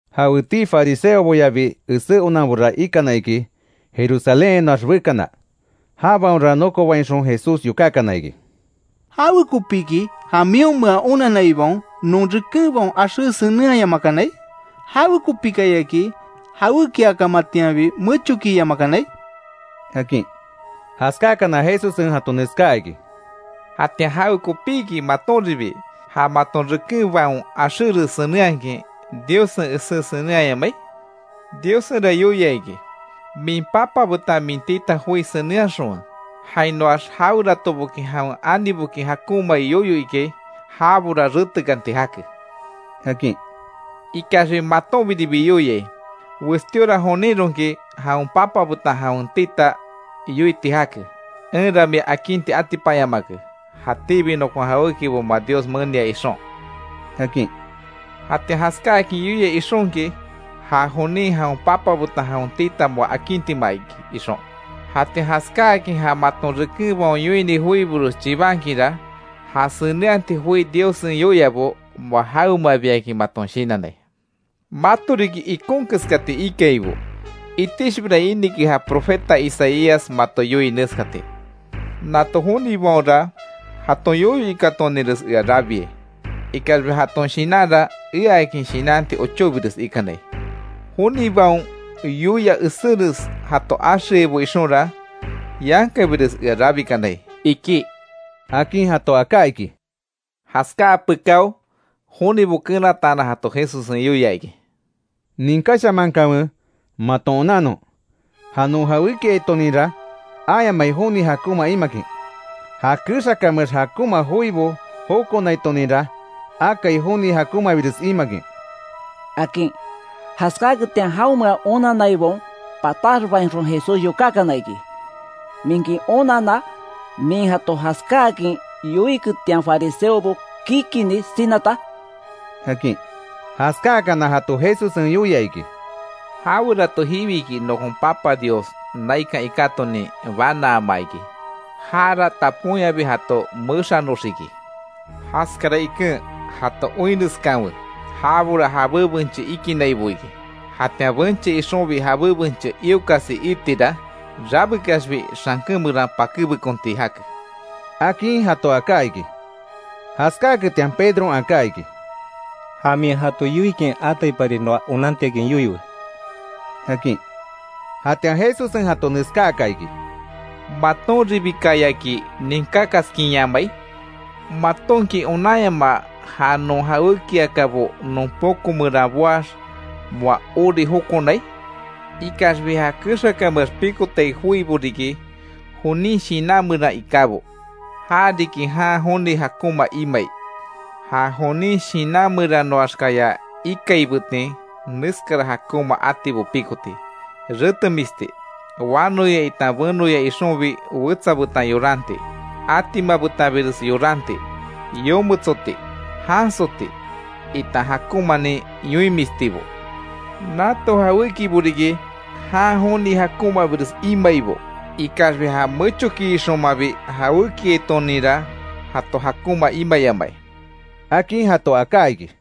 Jawetii fariseoboyabi esé onanbora ikana iki Jerusalénhainoax bekana, jabaonra nokobainxon Jesús yokákana iki: —¿Jawekopíki ja mionmea onanaibaon non rekenbaon axé senenhayamakanai? ¿Jawekopikayaki jawékiakamatianbi mechokiyamakanai? —akin. Jaskáakana, Jesussen jato neskaa iki: —¿Jatian jawekopíki matonribi, ja maton rekenbaon axéres senenhakin Diossen esé senenhayamai? Diossenra yoia iki: ‘Min papa betan min tita joi senenhaxonwe. Jainoax, jaweratoboki, jawen aniboki jakonmai yoyo ikai, jabora retekanti jake’, akin. Ikaxbi matonbiribi yoiai: Westíora joninronki jawen papa betan jawen tita yoiti jake: ‘Enra mia akinti atipanyamake, jatíbi nokon jawékibo moa Dios menia ixon’, akin. Jatian jaskáakin yoia ixonki, ja jonin jawen papa betan jawen tita moa akintima iki, ixon. Jatian jaskáakin ja maton rekenbaon yoini joibores chibankinra, ja senenhati joi Diossen yoiabo moa jawemabiakin maton shinannai. Mato riki ikon keskati ikaibo. Itixbira inike ja profeta Isaías mato yoii neskati: ‘Nato jonibaonra, jaton yoyo ikatoninres ea rabiai. Ikaxbi jaton shinanra eaakin shinanti ochóbires ikanai. Jonibaon yoia eséres jato axeaibo ixonra, yankabires ea rabikanai’, iki —akin jato aká iki. Jaskáa pekáo, jonibo kenataanan jato Jesussen yoia iki: —Ninkáshamankanwe, maton onannon. Ja non jawékiaitoninra ayamai joni jakonma imakin. Ja kexakameax, jakonma joibo jokonaitoninra, akai joni jakonmabires imakin —akin. Jaskaketian jaonmea onanaibaon, pataxbainxon Jesús yokákana iki: —¿Minki onanna, min jato jaskáakin yoiketian fariseobo kikini sinata? —akin. Jaskáakana jato Jesussen yoia iki: —Jawerato jiwiki, nokon papa Dios naikan ikátonin banaama iki, jara taponyabi jato mexanoxiki. Jaskara iken jato oinreskanwe, jabora, jabé benche ikinaibo iki. Jatian benche ixonbi jabé benche iokasi iitira, rabekaxbi xanken meran pakébekonti jake —akin jato aká iki. Jaskáketian Pedron aká iki: —Ja min jato yoikin ataipari noa onantiakin yoiwe —akin. Jatian Jesussen jato neskáaka iki: —¿Matonribikayaki ninkákaskinyamai? ¿Matonki onanyamaa ja non jawékiakabo non poko meran boax, moa ori jokonai? Ikaxbi ja kexakameax pikotai joibo riki, jonin shinan meran ikábo. Ja riki jan joni jakonma imai. Ja jonin shinan meranoaxkaya ikaibetin neskara jakonma atibo pikoti: Retemisti, wanoya itan benoya ixonbi wetsa betan yoranti, atima betanbires yoranti, yometsoti, jansoti itan jakonmanin yoinmistibo. Nato jawékibo riki jan joni jakonmabires imaibo. Ikaxbi ja mechokiixonmabi jawékiaitoninra, jato jakonma imayamai —akin jato aká iki.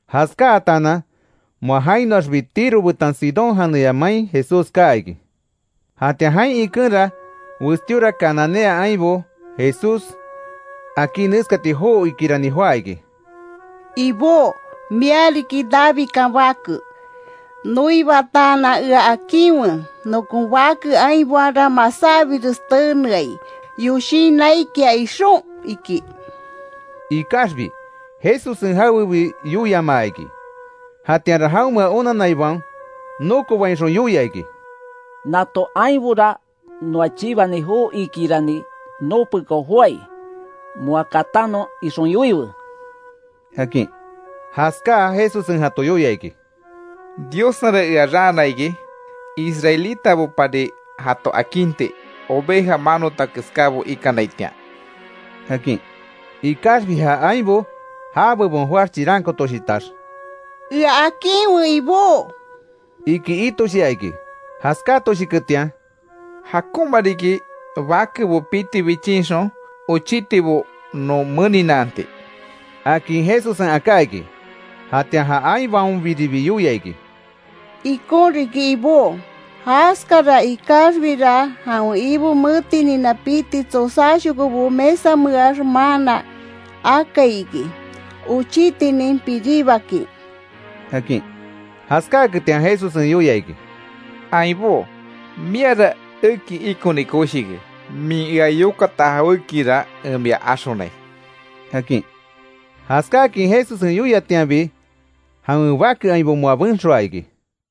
Jaskáatanan, moa jainoaxbi Tiro betan Sidón janeya main Jesús kaa iki. Jatian jain ikenra, westíora cananea ainbo, Jesús akí neskati joo iikirani joá iki: —Ibó, mia riki Davidkan Bake, noibataanan ea akinwe, nokon bake ainbaonra masábires teneai, yoshin naikia ixon —iki. Ikaxbi, Jesussen jawebi yoiamaa iki. Jatianra, jaonmea onanaibaon nokobainxon yoia iki: —Nato ainbora noa chibani joo iikirani noo pekao joái, moa katanon ixon yoiwe —akin. Jaskáa, Jesussen jato yoia iki: —Diossenra ea raana iki; israelitabopari jato akinti, oveja manota keskábo ikanaitian —akin. Ikaxbi ja ainbo, já bebon joáx chirankootoshitax: —Ea akinwe Ibó —iki itoshia iki. Jaskatoshiketian: —Jakonma riki bakebo piti bichinxon, ochítibo non meninaanti —akin Jesussen aká iki. Jatian ja ainbaonbiribi yoia iki: —Ikon riki Ibó jaskara; ikaxbira, jawen ibo metinina piti tsosáshokobo mesameax maana akai iki, ochitinin piribakin —akin. Jaskáaketian Jesussen yoia iki: —Ainbó, miara eki ikoni koshike, min ea yokata jawékira en mia axonai —akin. Jaskáakin Jesussen yoiatianbi, jawen bake ainbo moa benxoa iki.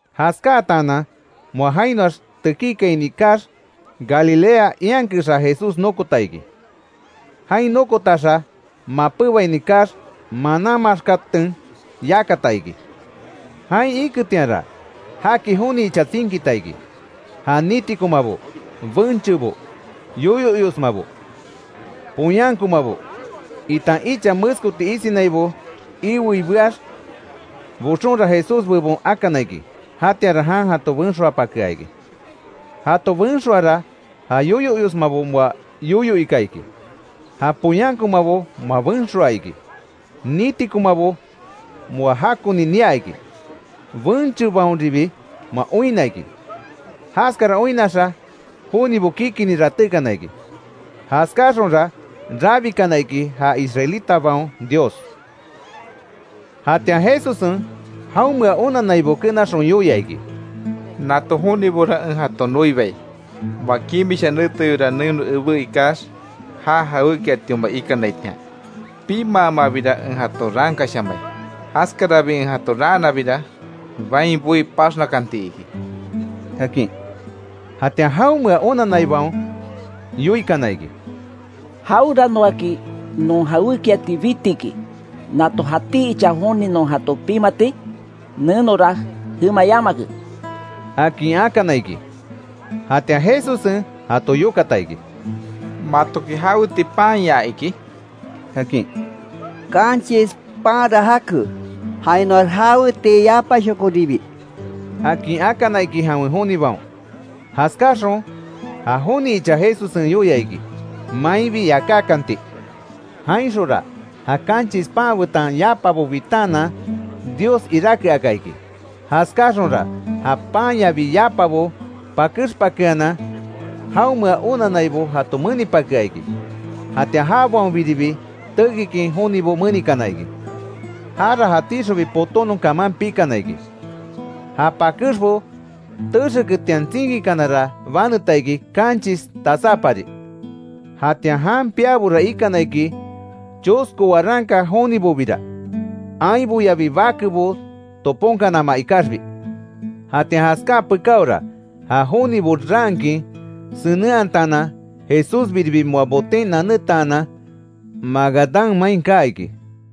Jaskáatanan, moa jainoax tekíkaini kaax, Galilea ian kexa Jesús nokota iki. Jain nokotaxa, mapébaini kaax, manan maxkaten yakata iki. Jain iketianra, jaki joni icha tsinkita iki. Ja nitikomabo, benchebo, yoyo iosmabo, poyánkomabo, itan icha meskoti isinaibo iwei beax. Boxonra Jesús bebon akana iki. Jatianra jan jato benxoapakea iki. Jato benxoara, ja yoyo iosmabo moa yoyo ika iki, ja poyánkomabo moa benxoa iki, nitikomabo moa jakoni nia iki, benchebaonribi moa oinna iki. Jaskara oinnaxa, jonibo kikini ratékana iki. Jaskáxonra rabikana iki ja israelitabaon Dios. Jatian Jesussen jaonmea onannaibo kenaxon yoia iki: —Nato jonibora en jato noibai, moa kimisha neteyora neno ebé ikax, ja jawékiatioma ikanaitian. Pimaamabira en jato raankashamai. Jaskarabi en jato raanabira, bain boí paxnakanti iki —akin. Jatian jaonmea onanaibaon yoikana iki: —¿Jaweranoaki non jawékiati bitiki, nato jatí icha joni non jato pimati? Nenora jema yamake —akin akana iki. Jatian Jesussen jato yokata iki: —¿Matoki jaweti panya iki? —akin. —Kanchis panra jake. Jainoax jaweti yapashokoribi —akin akana iki jawen jonibaon. Jaskáaxon ja joni icha Jesussen yoia iki mainbi yakákanti. Jainxonra, ja kanchis pan betan yapabo bitaanan, Dios iráke aka iki. Jaskáaxonra, ja panyabi yapabo pakexpakeanan jaonmea onannaibo jato menipakea iki. Jatian jabaonbiribi tekikin jonibo menikana iki. Jara jatíxonbi potónon kaman pikana iki. Ja pakexbo texeketian tsinkikanara baneta iki, kanchis tasápari. Jatian jan piabora ikana iki, chosko waranka jonibobira, ainboyabi bakebo toponkanama ikaxbi. Jatian jaskáa pekáora, ja jonibo raankin senenhataanan, Jesús biribi moa boten nanetaanan, Magadán main kaa iki.